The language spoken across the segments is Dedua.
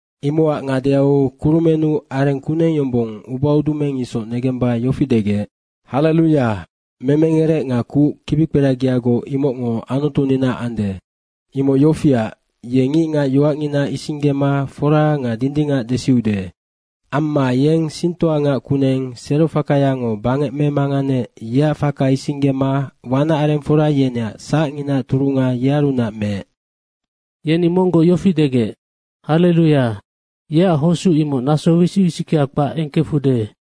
Imocac ngadeau kurumennu areng kuneng yombong ubaudumeng isoc negemba yofi degec, “Halleluya, memengerec nga kuc kibikperagiagoc, imocngo Anutuninaac ande. Imoc yofiac, ye ngicngac yoacngina isinggema fora nga dindingac desiude. Amma yeng singtoangac kuneng serofakayango bangec memanganeec, yeac faka isinggema wanacarengfora yeneac sacnginaac turunga yearunac meec.” Yeni monggoc yofi degec, “Halleluya, yeac hosuc imoc naso wisic wisickea kpac engkefude.”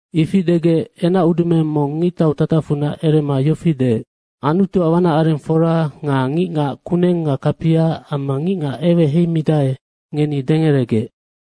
Ifi degec enacudumeng mong ngictau tatacfunac erema yofi deec, “Anutuac wanacarengfora nga ngicngac kuneng nga kapia amma ngicngac eweheimidae, ngeni dengeregec.”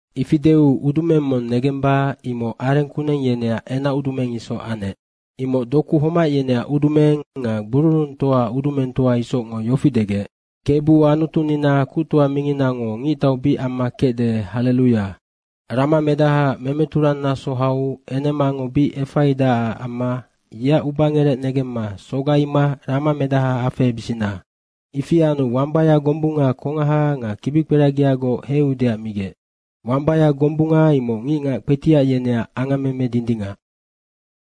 Ifi deu udumeng mong negemba, imoc areng kuneng yeneac enacudumeng isoc anec. Imoc doku homac yeneac udumeng nga gbururungtoaac udumengtoa isocngo yofi degec, “Kebu Anutunina kuctoa minginango ngictau bic amma kecde, halleluya. Ramamedahaac memeturangnaso hau enemango bic efaidacac amma yeac ubangerec negemma sogaima ramamedaha afehebisina. Ifi anu wambaya gombunga kongaha nga kibikperagiagoc heiudeac migec. Wambaya gombunga imoc ngicngac kpetiac yeneac angammeme dindingac.”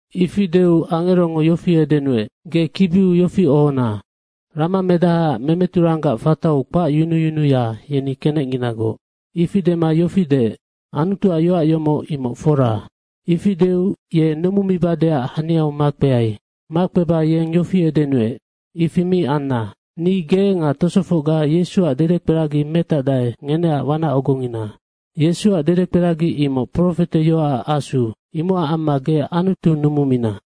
Ifi deu angerongo yofi edenuec, “Ge kibiu yofi ohona, Ramamedahaac memeturanggac fatau kpacyunuyunuya, yeni kenecnginagoc.” ifi dema yofi deec, “Anutuac yoac yomoc imoc fora.” Ifi deu ye numumibadeac haniau makpeai. Makpeba yeng yofi edenuec, “Ifi mi anna! Ni ge nga tosofocga Yesuac dedekperagi metacdae, ngeneac wanac ogongina. Yesuac dedekperagi imoc profeteyoacac asu. Imocac amma ge Anutu numumina.”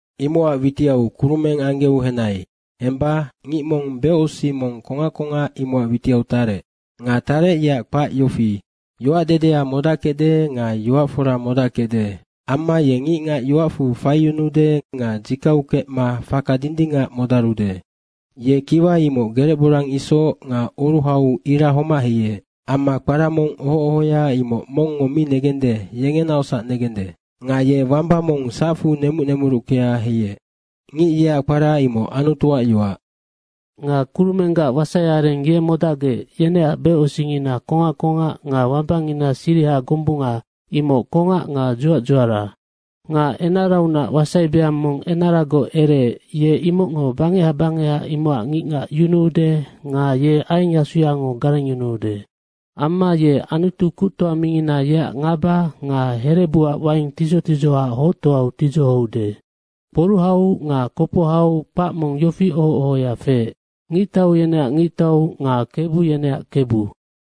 Imocac witiau kurumeng anggeu henai. Hemba ngic mong becosic mong kongac kongac, imocac witiau tarec. Nga tarec, yeac kpac yofi, Yoacdedea modackecde nga Yoac fora modackecde. Amma ye ngicngac yoacfu faiyunuude nga dzikau kecma faka dindingac modarude. Ye kiwa imoc gerec borang isoc nga oruhau ira homac heiec. Amma kpara mong oho ohoya, imoc mongngo mi negende, yengenaocsac negende. Nga ye wamba mong sacfu nemuc nemuruckea heiec. Ngic yeac kpara imoc Anutuac yoac. Nga kurumenggac wasaiareng ye modacgec, yeneac becosicngina kongac kongac nga wambangina siriha gombunga imoc kongac nga dzuac dzuara. Nga enaraunac wasai beang mong enaragoc ereec, ye imocngo bangeha bangeha imocac ngicngac yunuude nga ye aiengyasungo garengyunuude. Amma ye Anutu kuctoa mingina yeac ngaba nga herebuac waing tidzoc tidzohoac hoctoau tidzohoude. Kporuhau nga kopohau kpac mong yofi oho ohoya feec, “Ngictau yeneac Ngictau nga kebu yeneac Kebu.”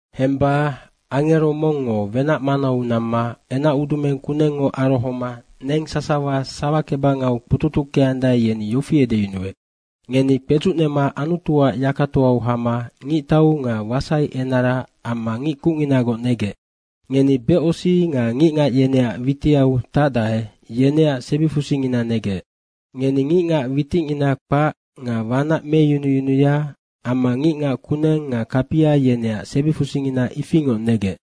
Hemba angero mongngo wenac manau namma enacudumeng kunengngo arohoma neng sasawa sawakebangau kpututuckeandae, yeni yofi edeyunuec, “Ngeni kpedzucnema Anutuac yakatoau hama ngictau nga wasaienara amma ngic kucnginagoc negec. Ngeni becosic nga ngicngac yeneac witiau tacdae, yeneac sebifusingina negec. Ngeni ngicngac witicngina kpac nga wanac meyunuyunuya amma ngicngac kuneng nga kapia, yeneac sebifusingina ifingoc negec.”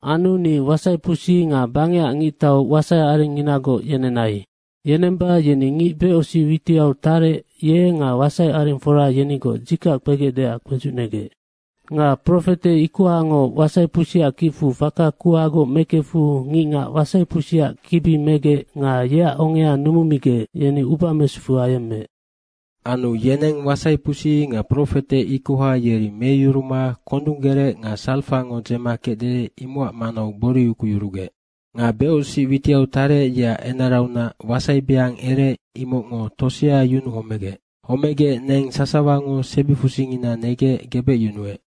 Anu ni wasaipusi nga bangecac ngictau wasaiarenginagoc yenenai. Yenemba yeni ngic becosic witiau tarec, ye nga wasaiarengfora yenigoc dzikac kpegecdeac kpedzucnegec. Nga profete ikohango wasaipusiac kicfu faka kuhagoc mekefu ngicngac wasaipusiac kibi megec nga yeac ongea numumigec, yeni ubamesufu ayemmeec. Anu yeneng wasaipusi nga profete ikoha yeri meyuruma kondung gerec nga sarfango dzema kecde, imocac manau gbori ukuyurugec. Nga becosic witiau tarec, yeac enaraunac wasai beang ereec, imocngo tosea yunuu homegec. Homegec neng sasawango sebifusingina negec gebecyunuec.